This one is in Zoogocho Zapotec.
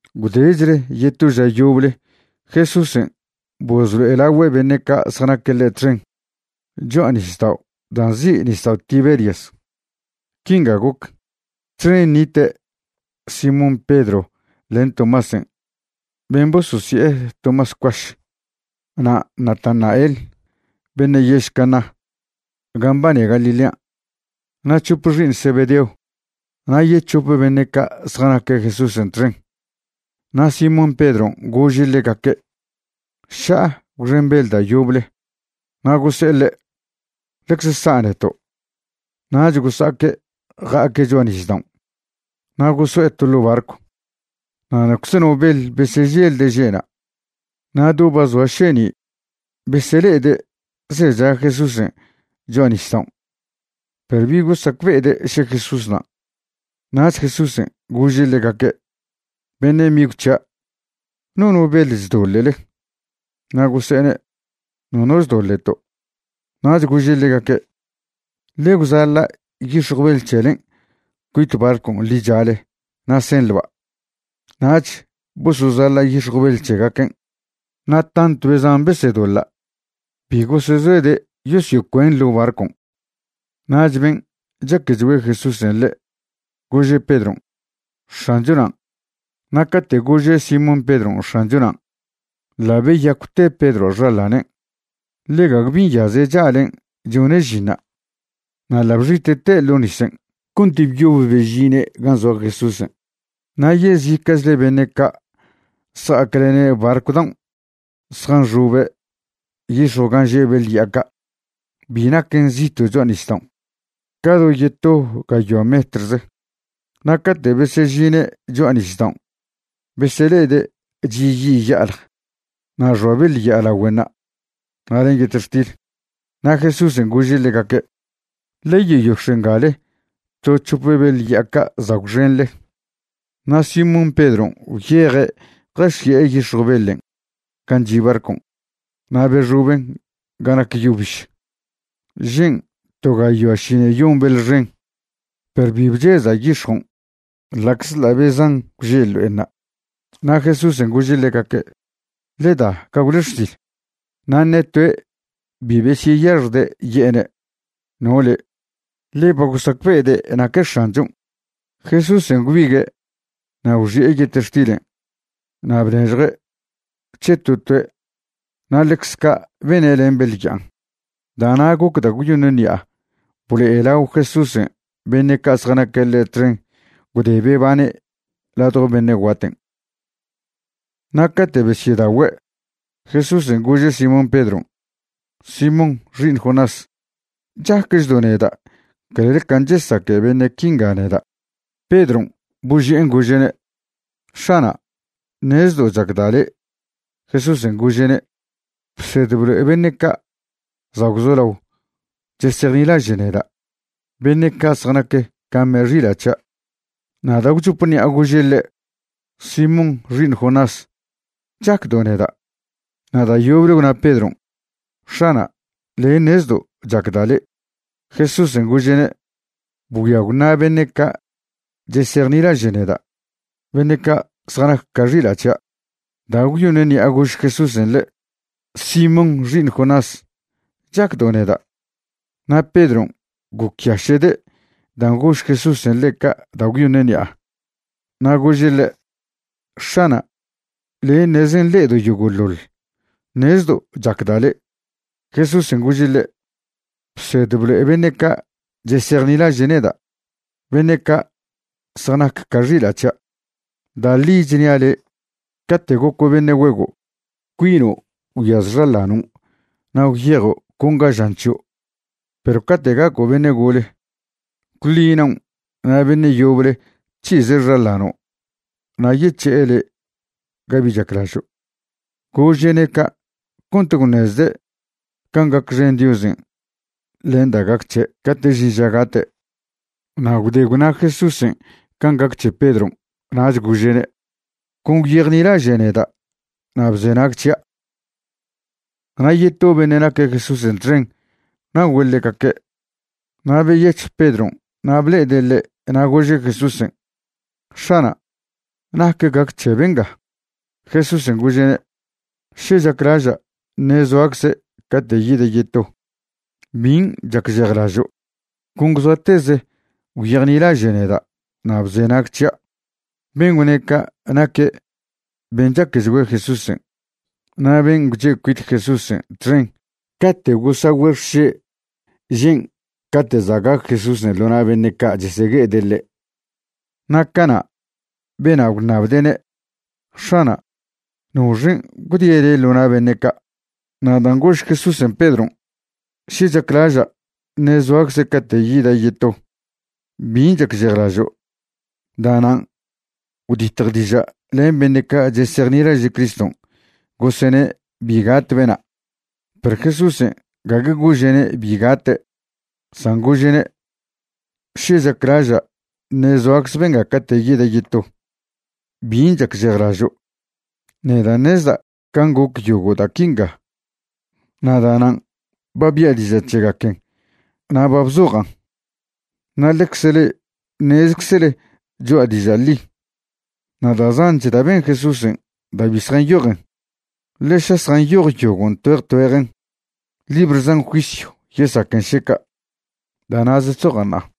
Gwdechle yeto ža yoble Jesúsen' bozlo'elagüe' beṉe' ca' zjanaque' ḻe' txen cho'a nisdao' da' nzi' Nisdao' Tiberias. Quinga goc: Txen nite' Simón Pedron' len Tomásen' ben' bososi'e Tomás Cuaš, na' Natanael beṉe' yež Caná gan' mbane Galilean', na' c̱hope xi'iṉ Zebedeo na' yec̱hope beṉe' ca' zjanaque' Jesúsen' txen. Na' Simón Pedron' gože' ḻegaque': ―Ša'a gwxen beḻ da' yoble. Na' gose'e ḻe': ―Ḻecze sa' neto'. Nach gosa'aque' ja'aque' cho'a nisdaon' na' goso'e to ḻo' barcw. Na' nocze no beḻ beseželde' že'na'. Na' do ba zoa šeni' besele'ede' zecha Jesúsen' cho'a nisdaon', perw bi gosacbe'ede' še Jesús nan'. Nach Jesúsen' gože' ḻegaque': ―Beṉe' migw c̱hia' ¿nono beḻ chdoḻe'le? Na' gose'ene': ―Nono chdoḻe'to'. Nach gože' ḻegaque': ―Ḻe gwzaḻa' yix̱jw beḻ c̱helen' cuit barcon' ḻichale na' senḻba'. Nach bosozaḻa' yix̱jw beḻ c̱hegaquen', na' tantw be zan besedoḻa', bi gosezoede' yosyocuen' ḻo' barcon'. Nach ben' chaquechgüe Jesúsen' le', gože' Pedron': ―X̱ancho nan'. Na' cate' gože' Simón Pedron' X̱ancho nan', ḻa' beyacwte Pedroa' xaḻanen', ḻe gague bi nyaze' cha'len' chone' žinṉa', na' ḻa' bxite'te' ḻo' nisen' cont byob bežine' gan' zoa Jesúsen'. Na' yezica'chle beṉe' ca' zja'aclene' barcw daon' zjanxobe' yix̱jw gan' že' beḻ ya'a ca'. Bi naquen zito' cho'a nisdaon', ca do yeto gayoa metrze. Na' cate' besyežine' cho'a nisdaon' besele'ede' chi' yi' ya'alj na' xoa beḻ ya'a lagüenṉa' na' len yetextil. Na' Jesúsen' gože' ḻegaque': ―Ḻe yeyox̱e' ngale to c̱hope beḻ ya'a ca' za' gwxenḻe. Na' Simón Pedron' gwyeje' jaxi'e yix̱jw beḻen' gan' chi' barcon' na' bexoben' ga nac yo biž. Žen' to gayoa ši'iṉeyon beḻ xen, perw bi bcheza' yix̱jon' ḻa'czḻa' be zan gwže' ḻo'enṉa'. Na' Jesúsen' gože' ḻegaque': ―Ḻe da gagwle xsil. Na' ṉe toe' bi besyeyaxjde' ye'ene': “¿No le'?”, ḻe ba gosacbe'ede' naque' X̱anchon'. Jesúsen' gwbigue' na' gwxi'e yetextilen' na' bnežjue' c̱he to toe' na' ḻecz ca' bene' len beḻ ya'an. Da'na' goc da' gwyoṉ ṉi'a blo'elao Jesúsen' beṉe' ca' zjanaque' ḻe' txen gwde bebane' ladjo beṉe' guaten'. Na' cate' besyedagüe', Jesúsen' gože' Simón Pedron': ―Simón xi'iṉ Jonás, ¿chaquechdo' neda' clel can' chesaque beṉe' quinga neda'? Pedron' boži'en gože'ne': ―X̱ana', ṉezdo' chacda' le'. Jesúsen' gože'ne': ―Bsed blo'e beṉe' ca' za' gwzolao chesejnilaže' neda', beṉe' ca' zjanac ca me' xila' c̱hia'. Na' da' gwchop ṉi'a gože' ḻe': ―Simón xi'iṉ Jonás, ¿chacdo' neda'? Na' da' yoble gwna Pedron': ―X̱ana', le' ṉezdo' chacda' le'. Jesúsen' gože'ne': ―Bgüia gwṉa' beṉe' ca' chesejnilaže' neda', beṉe' ca' zjanac ca xila' c̱hia'. Da' gwyoṉ ṉi'a gož Jesúsen' ḻe': ―Simón xi'iṉ Jonás, ¿chacdo' neda'? Na' Pedron' gocyaše'de' dan' gož Jesúsen' ḻe' ca' da' gwyoṉ ṉi'a, na' gože' ḻe': ―X̱ana', le' ṉeze nḻe'edo' yogo'ḻoḻ. Ṉezdo' chacda' le'. Jesúsen' gože' ḻe': ―Bsed blo'e beṉe' ca' chesejnilaže' neda', beṉe' ca' zjanac ca xila' c̱hia'. Da' ḻi chnia' le', cate' goco' beṉe' güego', cuino' gwyaz xaḻanon' na' gwyejo' con ga žan c̱hio'. Perw cate' gaco' beṉe' gole, gwḻi naon' na' beṉe' yoble c̱hize' xaḻano' na' yec̱he'e le' ga bi chaclažo'. Gože'ne' ca' cont gwṉezde' can' gacxen Diozen' len da' gac c̱he' cate' žin ža gate'. Na' gwde gwna Jesúsen' can' gac c̱he Pedron' nach gože'ne': ―Con gwyejnilaže' neda' na' bzenag c̱hia'. Na' yeto beṉe' naque' Jesúsen' txen na'ogüe' ḻegaque'. Na' beyec̱hj Pedron' na' ble'ede' ḻe' na' gože' Jesúsen': ―X̱ana', ¿nac gac c̱he benga? Jesúsen' gože'ne': ―Še chaclaža' ṉe' zoacze' cate' yida' yeto ¿bin' chacžejlažo'? Con gwzoateze gwyejnilaže' neda' na' bzenag c̱hia'. Ben' gwne' ca' naque' ben' chaquechgüe Jesúsen' na' ben' gwche' cuit Jesúsen' txen cate' gosagüe' xše' žen' cate' za' gac Jesúsen' ḻo na' beṉe' ca' chesegue'ede' ḻe'. Na' cana' bena' gwṉabde'ne': “X̱ana', ¿noxen' gwdie' le' ḻo na' beṉe' ca'?” Na' dan' gož Jesúsen' Pedron': “Še chaclaža' ṉe zoacze' cate' yida' yeto ¿bin' chacžejlažo'?”, da'nan' gwditj diža' len beṉe' ca' chsejnilaže' Criston' gosene' bi gat bena'. Perw Jesúsen' gague gože'ne' bi gate', san gože'ne': “Še chaclaža' ṉe' zoacz benga cate' yida' yeto, ¿bin' chacžejlažo'?” Nedan' ṉezda' can' goc yogo' da' quinga na' da'nan' ba bia' diža' c̱hegaquen na' ba bzojan'. Na' ḻecze le'e ṉezczele choa' diža' ḻi. Na' da' zanch da' ben Jesúsen' da' bi zjanyojen, ḻe ša zjanyoj yogon' tgüeje tgüejen, libr zan juisyw yesaquen še ca'. Da' na'ze chzoja' ṉa'a.